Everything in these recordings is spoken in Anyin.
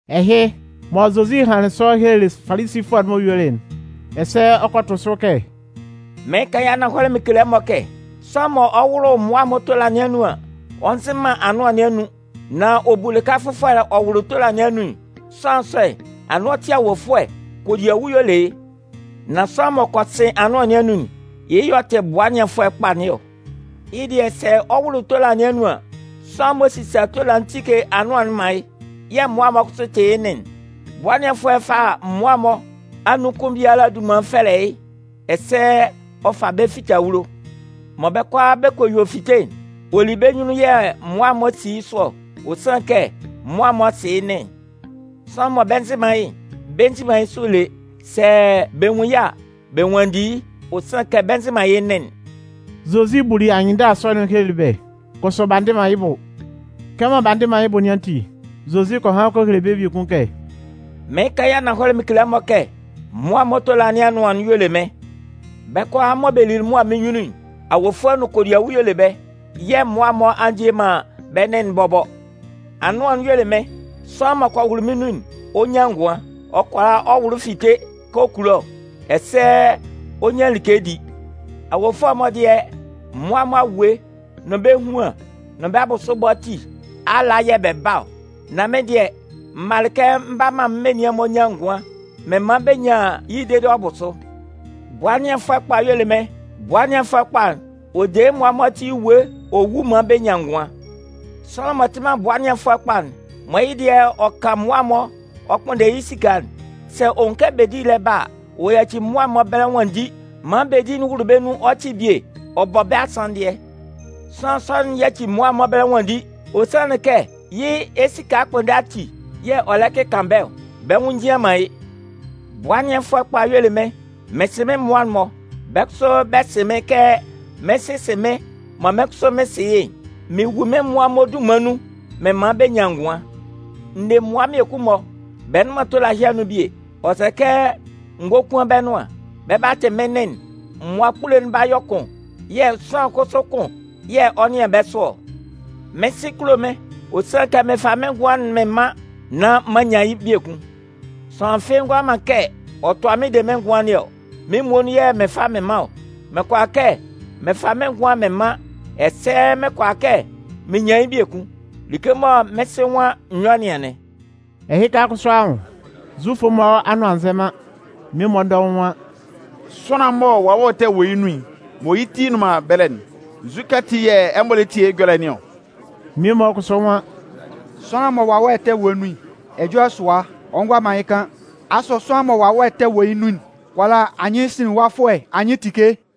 Ɛhɩ, mɔ Zozi hanlɩn sɔ helelɩ Falisifʋɛ'n-mɔ yuelɩ'n, ɛsɛ ɔ kɔ tʋ sʋ kɛ: “Mɩɩn kan yɩ́ ananhɔlɛ mɩn kele ɛmɔ kɛ, sʋanlan mɔ ɔ 'wʋlʋ mmʋa'n-mɔ tola nɩn anun an, ɔ nzɩn man anʋan nɩn anun, nan ɔ bu lɩka fʋfɔlɛ ɔ wʋlʋ tola nɩn anun'n, sʋanlan sɔ'n, anɩn ɔ tɩ awofʋɛ, kodiawu y'ɔ le yɩ́. Nan sʋanlan m'ɔ kɔ sɩn anʋan nɩn anun'n, yɩ́ yɛ̂ ɔ tɩ bʋa ɛnɩanfʋɛ kpa nɩn ɔ. Yɩ́ dɩɛ sɛ ɔ 'wʋlʋ tola nɩn anun an, sʋanlan'n m'ɔ sisa tola'n tike anʋan'n man yɩ́, yɛ̂ mmʋa'n-mɔ kʋsʋ tɩ yɩ́ nɩn'n. Bʋa ɛnɩanfʋɛ'n fa mmʋa'n-mɔ anun kʋn biala dunman'n fɛlɛ yɩ́ ɛsɛ ɔ fa bɛ́ fite awulo. Mɔ bɛ́ kʋalaa bɛ kɔ yue fite'n, ɔ li bɛ́ nyunnun yɛ̂ mmʋa'n-mɔ si yɩ́ sʋ ɔ. Ɔ sanlɩn kɛ mmʋa'n-mɔ sɩ yɩ́ nɩn'n. Sʋanlan mɔ bɛ nzɩ man yɩ́'n, bɛ nzi man yɩ́ sʋ lé. Sɛ bɛ nwun yɩ́ a, bɛ nwanndi yɩ́, ɔ sanlɩn kɛ bɛ nzɩ man yɩ́ nɩn'n.” Zozi buli anyɩnndala sɔ'n helelɩ bɛ́, kʋsʋ b'a ndɩ man yɩ́ bʋ. Kɛmɔ b'a ndɩ man yɩ́ bʋ nɩn ati, Zozi kɔ han kɔ hele bɛ́ biekun kɛ: “Mɩɩn kan yɩ́ ananhɔlɛ mɩn kele ɛmɔ kɛ, mmʋa'n-mɔ tola nɩn anʋan'n y'ɔ le mɩ́n. Bɛ́ kʋalaa mɔ bɛ lili mʋa mɩ́n nyunnun'n, awofʋɛ nʋn kodiawu y'ɔ le bɛ́. Yɛ̂ mmʋa'n-mɔ a ndie man bɛ́ nɩn'n bɔbɔ. Anʋan'n y'ɔ le mɩ́n. Sʋanlan m'ɔ kɔ wʋlʋ mɩ́n nun'n, ɔ 'nyan ngʋan. Ɔ kʋala ɔ wʋlʋ fite kɛ ɔ kulo ɔ, ɛsɛ ɔ 'nyan like di. Awofʋɛ'n-mɔ dɩɛ, mmʋa'n-mɔ awue, nʋn bɛ́ ehuan, nʋn bɛ́ bʋsʋ ɛbɔ ati ala yɛ̂ bɛ ba ɔ. Nan mɩ́n dɩɛ, m malɩ kɛ m 'ba maan menian'n-mɔ nyan ngʋan, mɩn man bɛ nyan yɩ́ dede ɔ bʋ sʋ. “Bʋa ɛnɩanfʋɛ kpa'n y'ɔ le mɩ́n. Bʋa ɛnɩanfʋɛ kpa'n, ɔ de yɩ́ mmʋa'n-mɔ ati ewue ɔ wu maan bɛ nyan ngʋan. Sʋanlan m'ɔ tɩ man bʋa ɛnɩanfʋɛ kpa'n, mɔ yɩ́ dɩɛ ɔ kan mmʋa'n-mɔ ɔ kpʋnndɛ yɩ́ esika'n, sɛ ɔ nwun kɛ bedi'n lɛ ba a, ɔ yaci mmʋa'n-mɔ ɛbɛlɛ nwanndi maan bedi'n wʋlʋ bɛ́ nun ɔ cɩ bie ɔ bɔ bɛ́ asanndɩɛ. Sʋanlan sɔ'n yaci mmʋa'n-mɔ ɛbɛlɛ nwanndi, ɔ sanlɩn kɛ yɩ́ esika ɛkpʋnndɛ ati yɛ̂ ɔ lɛ kɩkan bɛ́ ɔ. Bɛ́ nwʋn njian man yɩ́. Bʋa ɛnɩanfʋɛ kpa'n y'ɔ le mɩ́n. Mɩn sɩ mɩ́n mmʋa'n-mɔ, bɛ́ kʋsʋ bɛ sɩ mɩ́n kɛ mɩ́n Sɩ sɩ mɩ́n mɔ mɩ́n kʋsʋ mɩn sɩ yɩ́'n. Mɩn wu mɩ́n mmʋa'n-mɔ dunman nun mɩn man bɛ nyan ngʋan. N ne mmʋa mmiekun-mɔ, bɛ nnʋn man tola ɛhɩ anun bie. Ɔ sɛ kɛ n gókuan bɛ́ nʋan. Bɛ 'ba tɩ mɩ́n nɩn'n. Mmʋa kpule'n 'ba yɔ kʋn. Yɛ̂ sʋanlan kʋsʋ kʋn yɛ̂ ɔ 'nɩan bɛ́ sʋ ɔ. “Mɩ́n Sɩ kulo mɩ́n, ɔ sanlɩn kɛ mɩn fa mɩ́n ngʋan'n mɩn man nán m'an nyan yɩ́ biekun. Sʋanlan fɩ́ɩ́ ngʋala man kɛ ɔ tʋa mɩ́n de mɩ́n ngʋan nɩn ɔ. Mɩ́n muonun yɛ̂ mɩn fa mɩn man ɔ. Mɩn kʋala kɛ mɩn fa mɩ́n ngʋan'n mɩn man, ɛsɛ mɩn kʋala kɛ mɩn nyan yɩ́ biekun. Like mɔ mɩ́n Sɩ nwan n yɔ́ nɩn anɩn.” Ɛhɩka kʋsʋ anwʋn, Zufʋ'n-mɔ anʋan a nzɛ man. Mmie-mɔ dɔʋn nwan: “Sʋanlan'n mɔ wawɛ ɛtɛ wɔ yɩ́ nun mɔ yɩ́ ti nnʋn man ɛbɛlɛ'n, nzukɛ ati yɛ̂ ɛmɔ lɛ tie yɩ́ ɛjɔlɛ nɩn ɔ?” Mmie-mɔ kʋsʋ nwan: “Sʋanlan mɔ wawɛ ɛtɛ wɔ yɩ́ nun'n, ɛjɔlɛ sʋa, ɔ ngʋala man yɩ́ kan. Asʋ sʋanlan mɔ wawɛ ɛtɛ wɔ yɩ́ nun'n kʋala anyɩnsinlinwafʋɛ anyɩn tike?”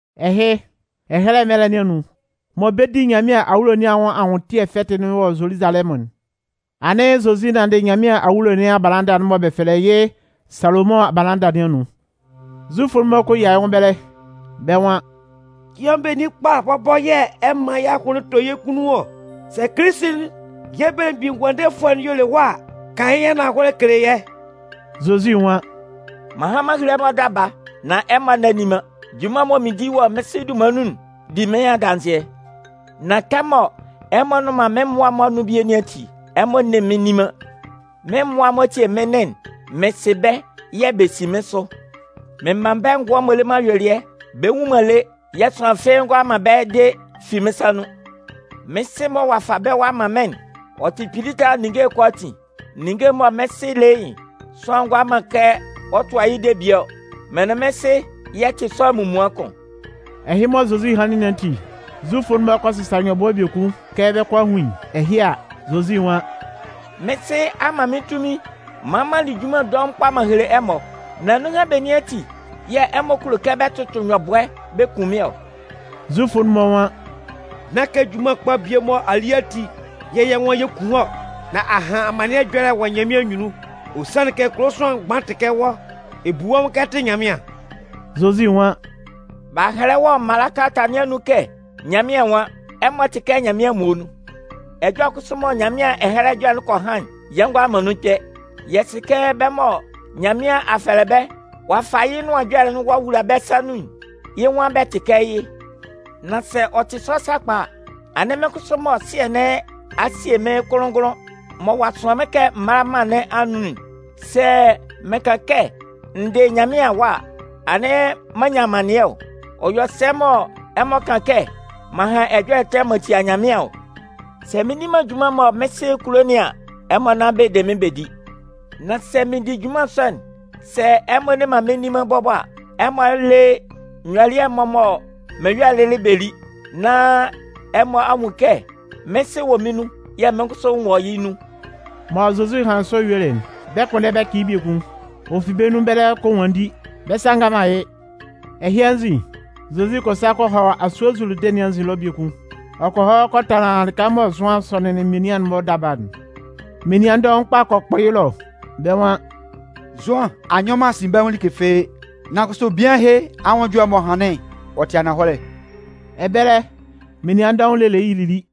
Ɛhɩ, ɛyɛlɛ mɛlɛ nɩn anun, mɔ bɛ 'di Nyanmɩan awulo nɩn anwʋn Anwʋntɩɛ fɛtɩ'n wɔ Zoluzalɛmʋn'n, anɩn Zozi nanndɩ Nyanmɩan awulo nɩn abalanda'n mɔ bɛ fɛlɛ yɩ́ Salomʋn abalanda nɩn anun. Zufʋ'n-mɔ kɔ yia yɩ́ nwʋn ɛbɛlɛ, bɛ́ nwan: “Cɩan benin kpa bɔbɔ yɛ̂ ɛ 'man yɛ́ ahʋnlɩn tɔ yɛ́ kunnun ɔ? Sɛ Kilisi'n, yɛ́ Belemgbin Ngʋandefʋɛ'n y'ɔ le wɔ́ a, kan yɩ́ ananhɔlɛ kele yɛ́.” Zozi nwan: “M'an han m'an hele ɛmɔ daba, nan ɛmɔ nne nni man. Junman'n mɔ mɩn di wɔ mɩ́n Sɩ dunman nun'n di mɩ́n adanzɩɛ. Nan kɛmɔ ɛmɔ nnʋn man mɩ́n mmʋa'n-mɔ anun bie nɩn ati, ɛmɔ nne mɩ́n nni man. Mɩ́n mmʋa'n-mɔ tie mɩ́n nɩn'n, mɩn sɩ bɛ́ yɛ̂ bɛ si mɩ́n sʋ. Mɩn man bɛ́ ngʋan m'ɔ le man ayuelɩɛ. Bɛ nwu man lé, yɛ̂ sʋanlan fɩ́ɩ́ ngʋala man bɛ́ de fi mɩ́n sa nun. Mɩ́n Sɩ mɔ ɔ'a fa bɛ́ ɔ'a man mɩ́n'n, ɔ tɩ kpili tala ninnge'n kʋalaatin. Ninnge'n mɔ mɩ́n Sɩ le yɩ́'n, sʋanlan ngʋala man kɛ ɔ tʋa yɩ́ de bie ɔ. Mɩn nʋn mɩ́n Sɩ, yɛ tɩ sʋanlan munmuan kʋn.” Ɛhɩ mɔ Zozi hanlɩn nɩn ati, Zufʋ'n-mɔ kɔ sɩsa nyɔbʋɛ biekun kɛ bɛ 'kɔ a hun yɩ́. Ɛhɩ a, Zozi nwan: “Mɩ́n Sɩ a man mɩ́n tunmin maan m'an li junman dɔʋn kpa m'an hele ɛmɔ, nan nunhan benin ati yɛ̂ ɛmɔ kulo kɛ bɛ 'tʋtʋ nyɔbʋɛ bɛ kun mɩ́n ɔ?” Zufʋ'n-mɔ nwan: “Nán kɛ junman kpa bie mɔ a li ati yɛ̂ yɛ́ nwan yɛ 'kun wɔ́ ɔ, nan a han amannɩɛ ɛjɔlɛ wɔ Nyanmɩan anyunnun. Ɔ sanlɩn kɛ kulo sʋanlan mgban tɩ kɛ wɔ́, ɛ bu wɔ́ nwʋn kɛ ɛ tɩ Nyanmɩan.” Zozi nwan: “B'a hɛlɛ wɔ ɛmɔ mala kalata nɩn anun kɛ Nyanmɩan nwan: Ɛmɔ tɩ kɛ mɩ́n Nyanmɩan muonun. Ɛjɔlɛ kʋsʋ mɔ Nyanmɩan Ɛhɛlɛ Ɛjɔlɛ'n kɔ han'n, yɛ ngʋala man nun kpɛ. Yɛ sɩ kɛ bɛ́ mɔ Nyanmɩan a fɛlɛ bɛ́ ɔ'a fa yɩ́ Nʋan Ɛjɔlɛ'n ɔ'a wula bɛ́ sa nun'n, yɩ́ nwan bɛ tɩ kɛ yɩ́. Nan sɛ ɔ tɩ sɔ sakpa a, anɩn mɩ́n kʋsʋ mɔ Sɩɛ nɩn a sie mɩ́n kʋnlʋn-ngʋnlʋn mɔ ɔ'a sʋan mɩ́n kɛ m mála mân nɩn anun'n, sɛ mɩn kan kɛ n dɩ Nyanmɩan Awa a, anɩn m'an nyan amannɩɛ ɔ? Ɔ yɔ sɛ mɔ ɛmɔ kan kɛ m'an han ɛjɔlɛ ɛtɛ m'an tia Nyanmɩan ɔ? Sɛ mɩn nni man junman'n mɔ mɩ́n Sɩ kulo nɩn an, ɛmɔ nán bɛ de mɩ́n bɛ di. Nan sɛ mɩn di junman sɔ'n, sɛ ɛmɔ nne man mɩ́n nni man bɔbɔ a, ɛmɔ lé nyɔlɩɛ'n-mɔ mɔ mɩn yɔ'n lɩlɩ bɛ lí, nán ɛmɔ a nwun kɛ mɩ́n Sɩ wɔ mɩ́n nun yɛ̂ mɩ́n kʋsʋ n wɔ yɩ́ nun.” Mɔ Zozi hanlɩn sɔ yuelɩ'n, bɛ 'kpʋnndɛ bɛ cɩ yɩ́ biekun. Ɔ fi bɛ́ nun ɛbɛlɛ ɔ kɔ nwanndi, bɛ́ sa a ngan man yɩ́. Ɛhɩ anzin, Zozi kɔ sa kɔ hɔ asue Zuludɩn nɩn anzin ɛlɔ biekun. Ɔ kɔ hɔ kɔ tanlan lɩka mɔ Zʋan sɔnɩnlɩn menian'n-mɔ daba'n. Menian dɔʋn kpa kɔ kpʋ yɩ́ ɛlɔ, bɛ́ nwan: “Zʋan a nyɔ man asinbɛnwʋn like fɩ́ɩ́, nan kʋsʋ bian ɛhɩ anwʋn ɛjɔlɛ m'ɔ hanlɩn'n, ɔ tɩ ananhɔlɛ.” Ɛbɛlɛ, menian dɔʋn lelɩ yɩ́ lili.